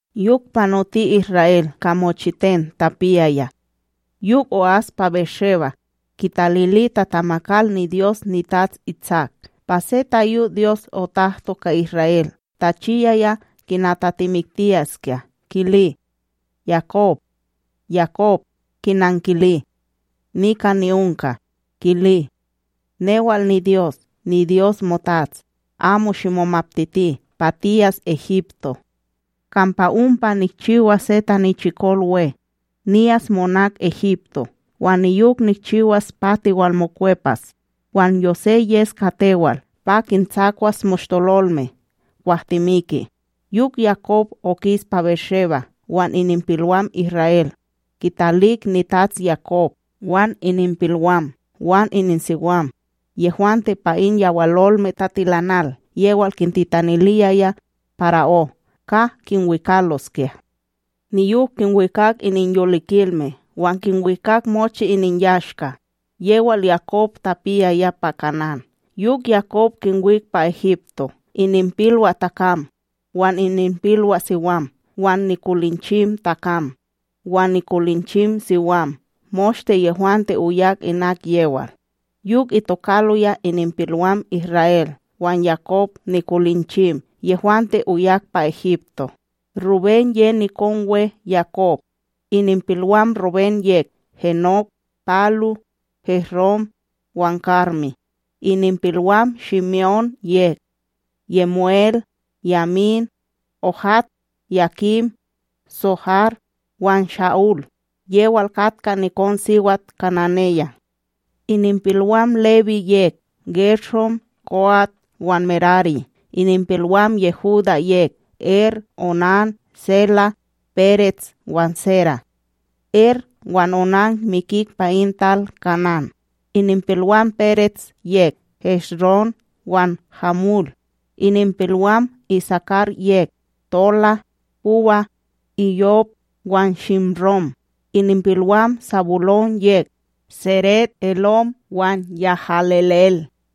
Yok panoti Isra'El ka mochiten tapiyaya. Yok o'as pa BérSheba, kitalili tatamakal niDyos nitats Itsak. Pa se tayo Dyos otahto ka Isra'El tachiyaya kina tatemiktiyaskya kili: ―Yakob! Yakob! Kinankili: ―Nika ni'onka. Kili: ―Newal niDyos, niDyos motats. Amo shimomaptiti pa tiyas Egipto, kampa ompa nikchiwas se tanichikol we. Niyas monak Egipto, wan niyok nikchiwas pa tiwalmokwepas. Wan Yosé yes ka tewal pa kintsakwas moshtololme kwah timiki. Yok Yakob okis pa BérSheba, wan ininpilwam Isra'El kitalik nitats Yakob, wan ininpilwam wan ininsiwam, yehwante pa in yawalolme tatilanal yewal kintitaniliyaya para'ó ka kinwikaloskya. Niyok kinwikak ininyolikilme wan kinwikak mochi ininyashka, yewal Yakob tapiyaya pa Kanán. Yok Yakob kinwik pa Egipto ininpilwaTakam wan ininpilwaSiwam wan nikolinchimTakam wan nikolinchimSiwam, moshte yehwante oyak inak yewal. Yok itokaloya ininpilwam Isra'El wan Yakob nikolinchim yehwante oyak pa Egipto:Rubén ye nikon we, Yakob. Ininpilwam Rubén yek: Henok, Palú, Hesrón wan Karmí. Ininpilwam Shime'ón yek: YemuEl, Yamín, Óhad, Yakín, Tsohar wan Sha'úl, yewal katka nikonSiwat kananeya. Ininpilwam Lewí yek: Gershón, Koat wan Merarí. Ininpilwam Yehudá yek: Er, Onán, Selá, Perets wan Séra. (Er wan Onán mikik pa in tal Kanán.)Ininpilwam Perets yek: Hesrón wan Hamul. Ininpilwam Isakar yek: Tolá, Puwá, Iyob wan Shimróm. Ininpilwam Sabulón yek: Séred, Elón wan YahalelEl.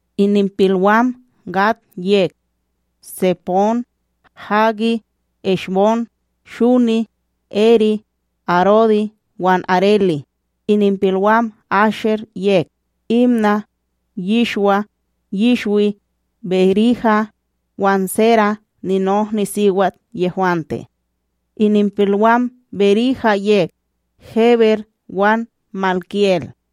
Ininpilwam Gad yek: Tsepón, Hagí, Eshbón, Shuní, Erí, Arodi wan Arelí. Ininpilwam Asher yek: Imná, Yishwá, Yishwí, Berihá wan Séra, ninohniSiwat yehwante.Ininpilwam Berihá yek: Héber wan MalkiEl.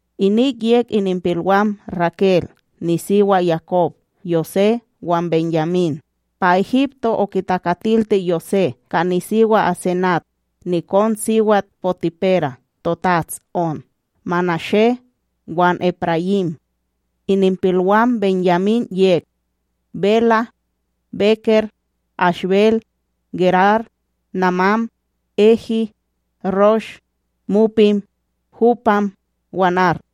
Inik yek ininpilwam Rakel, nisiwa Yakob: Yosé wan BenYamín. Pa Egipto, okitakatilti Yosé ka nisiwa Asenat, nikonSiwat Potipera, totats On: Manashé wan Eprayím. Ininpilwam BenYamín yek: Bela, Beker, Ashbel, Gerar, Namán, Ehi, Rosh, Mupim, Hupam wan Ard.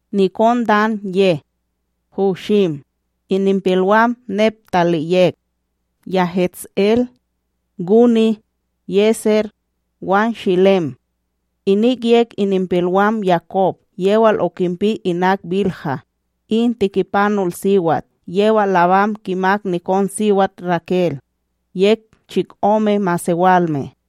Nikon Dan ye: Hushim. Ininpilwam Neptalí yek: YahetsEl, Guní, Yeser wan Shilem. Inik yek ininpilwam Yakob yewal okinpi inak Bilha. In tikipanolSiwat yewal Labán kimak nikonSiwat Rakel. Yek chikome masewalme.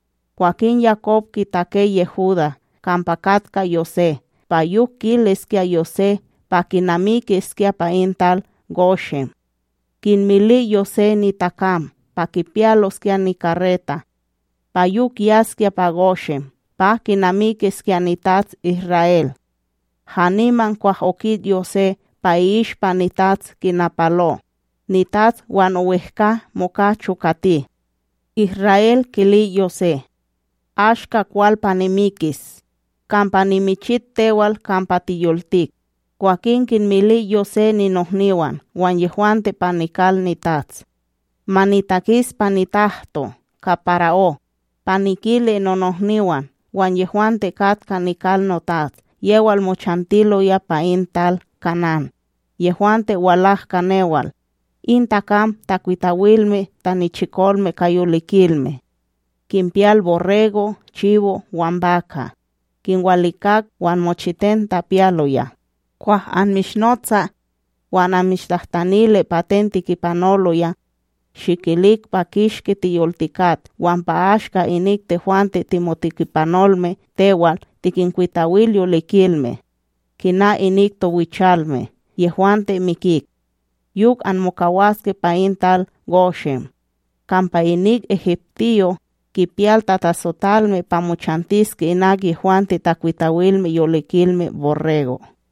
Kwakin Yakob kitake Yehudá kampa katka Yosé pa yok kiliskya Yosé pa kinamikiskya pa in tal Goshen. Kinmili Yosé nitakam pa kipiyaloskya nikareta, pa yok yaskya pa Goshen pa kinamikiskya nitats Isra'El. Haniman kwah okit Yosé pa i'ishpa nitats kinapalo, nitats wan owehkA moka chokati. Isra'El kili Yosé: ―Ashka kwal pa nimikis! kampa nimichit tewal kampa tiyoltik! Kwakin kinmili Yosé ninohniwan wan yehwante pa nikal nitats: ―Ma nitakis pa nitahto ka para'ó pa nikili nonohniwan, wan yehwante kat ka nikal notats, yewal mochantiloya pa in tal Kanán, yehwante walak ka newal. In takam takwitawilme tanichikolme ka yolikilme kinpiyal borrégo', chibo' wan baka', kinwalikak wan mochiten tapiyaloya. Kwah anmishnotsa wan anmishtahtanili pa ten tikipanoloya, shikilik pa kishki tiyoltikat wan pa ashka inik tehwante timotikipanolme tewal tikinkwitawil yolikilme, kina inik towichalme yehwante mikik. Yok anmokawaske pa in tal Goshen, kampa inik egiptiyo' kipiyal tatatsotalme pa mochantiske inak yehwante takwitawilme yolikilme borrego.